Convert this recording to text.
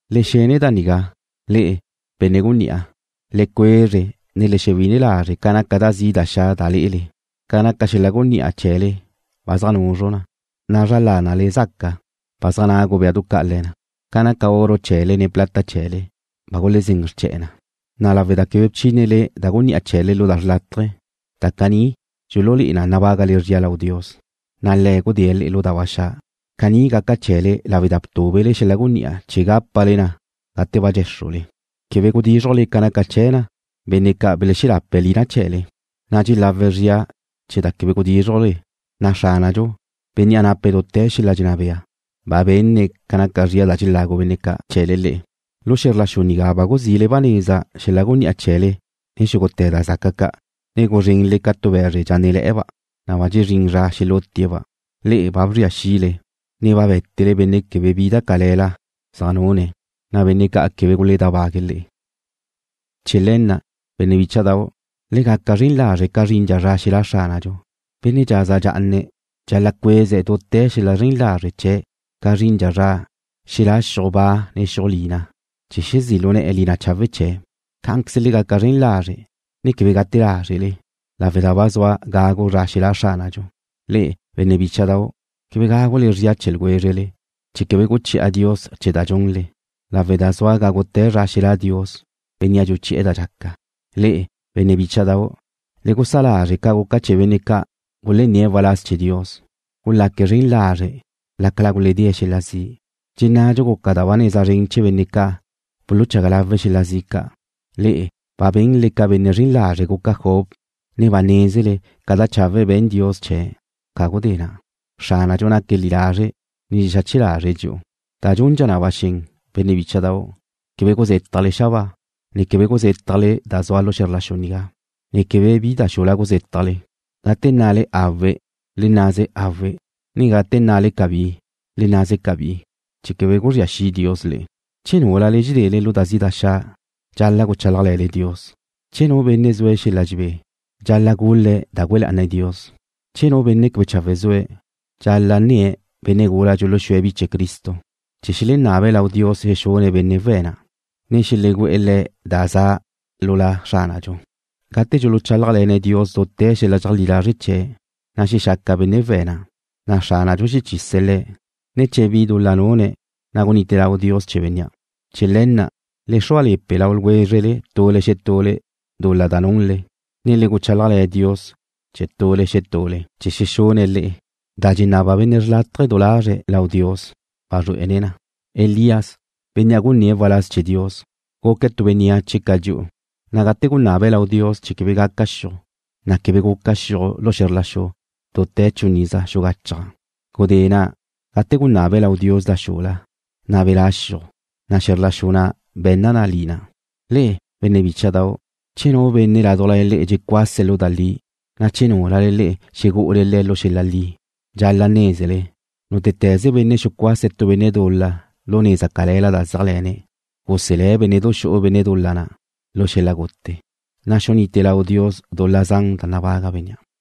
Le xene da nigá, le'e, benne' gunní'a. Le cuezre ne le xewine lazre' ca naca da zi' da xa' da lé'ele. Ca naca xel-la' gunní'a chee̱le ba zaj nuzru na, na' zra lánale zaca ba zaj nagu béadu ca' le̱ na. Ca naca oro chee̱le ne plata chee̱le, ba gulezén xrche̱'e̱ na, na' lawe' da quebe bchínele da gunní'a chee̱le lu da xrlátaje, da caní dxululé'e na nabágale zria lau Dios, na' Le̱' gudée̱' le'e lu da ba xa'. Caní gaca chee̱le lawe' da btúbele xel-la' gunní'a chee̱ gápale na gate ba dxéxrule. Quebe gudízrujle ca naca chee̱ na benne' ca' belexelape̱' lina chee̱le, na' dxelawe̱' zria chee̱ da quebe gudízrujle, na' Xránadxu, Bénnea' nape̱' dute̱ xel-la' dxenná bea, ba benne̱' ca naca zria da dxelagu benne' ca' chee̱le le'e. Lu xe̱zr la xu nigá ba guzile ba neza xel-la' gunní'a chee̱le ne xúgute̱ da zaca ca', ne guzrenle ca tu be̱zre dxánnele̱'e̱, na' ba dxezrín zra xelútie̱'-ba'. Le'e ba bzria xile, ne ba bé̱tele benne' quebe bi da cale̱la zaj nune̱', na' benne' ca' quebe guledábague̱' le'e. Chee̱ le̱ na', benne' bícha'dau', le gaca zren lazre' ca zrindxa zra xelá' Xránadxu. Benne' dxaza dxa'ana dxal-la' cueze̱' dute̱ xel-la' zren lazre' chee̱' ca zrindxa zra xelá' xiuj ba ne xiuj lina, chee̱ xezí' lu ne̱'e̱ lina chawe' chee̱'. Cá'anqueze le gaca zren lazre', ne quebe gute lázrele, lawe' da ba zua gagu zra xelá' Xránadxu. Le'e, benne' bícha'dau', quebe gágule zria chee̱ ljwézrele, chee̱ quebe guchi'a Dios chee̱ da dxunle, lawe' da zua gágute̱ zra xelá' Dios, Bénnea' dxuchi'e̱ da dxaca. Le'e, benne' bícha'dau', le gusá lázrele ca guca chee̱ benne' ca' gulenné̱' waláz chee̱ Dios, gulaque̱' zren lazre' lácala guledée' xel-la' zi'. Dxennadxu guca da ba neza zren chee̱ benne' ca' buluchaga lawe̱' xel-la' zi' ca'. Le'e ba benle ca benne' zren lazre' guca Job, ne ba nézele ca da chawe' be̱n Dios chee̱' ca gudé na'. Xránadxu naque̱' zri'i lazre', ne dxexache lazre̱' dxi'u. Da dxundxa na ba xen, benne' bícha'dau', quebe guzétajle xabáa, ne quebe guzétajle da zua xe̱zr la xu nigá, ne quebe bi da xula guzétajle. Gate nnale: Awe', le nnaze: Awe', ne gate nnale: Cabí, le nnaze: Cabí, chee̱ quebe guzría xi' Dios le'e. Che núlale dxedele lu da zi' da xa', dxal-la' guchálajle̱nle Dios. Che nu benne' zue̱' xel-la' dxebé, dxal-la' gul-le̱' da güe lá'ane̱' Dios. Che nu benne' quebe chawe' zue̱', dxal-la' nne̱' benne' gula ca' dxuluxúe̱' bi chee̱ Cristo, chee̱ xelenabe̱' lau Dios xexune̱' benne' we̱' na', ne xelegú'e̱ le̱' da za lu La Xránadxu. Gate dxuluchálajle̱ne̱' Dios dute̱ xel-la' dxeleajlí lazre' chee̱', na' xexaca benne' we̱' na', na' Xránadxu xechise̱' le̱', ne che bi dul-la nune̱', na' gunite lau Dios chee̱ bénnea'. Chee̱ le̱ na', le xrúale̱pe lau ljwézrele tule xetule dul-la da nunle, ne le guchálajle̱ Dios chee̱ tule xetule, chee̱ xexune̱' le'e. Da dxenaba benne' xrlátaje̱ du lazre̱' lau Dios wazrué'ene̱' na. Elías, bénnea' gunné̱' waláz chee̱ Dios, guque̱' tu bénneache ca dxi'u, na' gate gunabe̱' lau Dios chee̱ quebe gaca xiuj, na' quebe guca xiuj lu xe̱zr la xu dute̱ chun iza xugachaj. Gudé na', gate gunabe̱' lau Dios da xula, na' belá' xiuj, na' xe̱zr la xu na' be̱nna na lina. Le'e, benne' bícha'dau', che nu benne' ládujla le'e dxecuase̱' lu da li, na' che núlale le'e xegu'ule le̱' lu xel-la' li, dxal-la' nézele, nútete̱ze benne' xucuase̱' tu benne' dul-la lu neza cale̱la da zeajle̱ne̱', guselé̱' bénne'du xu'u benne' dul-la na' lu xel-la' gute, na' xunite lau Dios dul-la zan da nabaga bénnea'.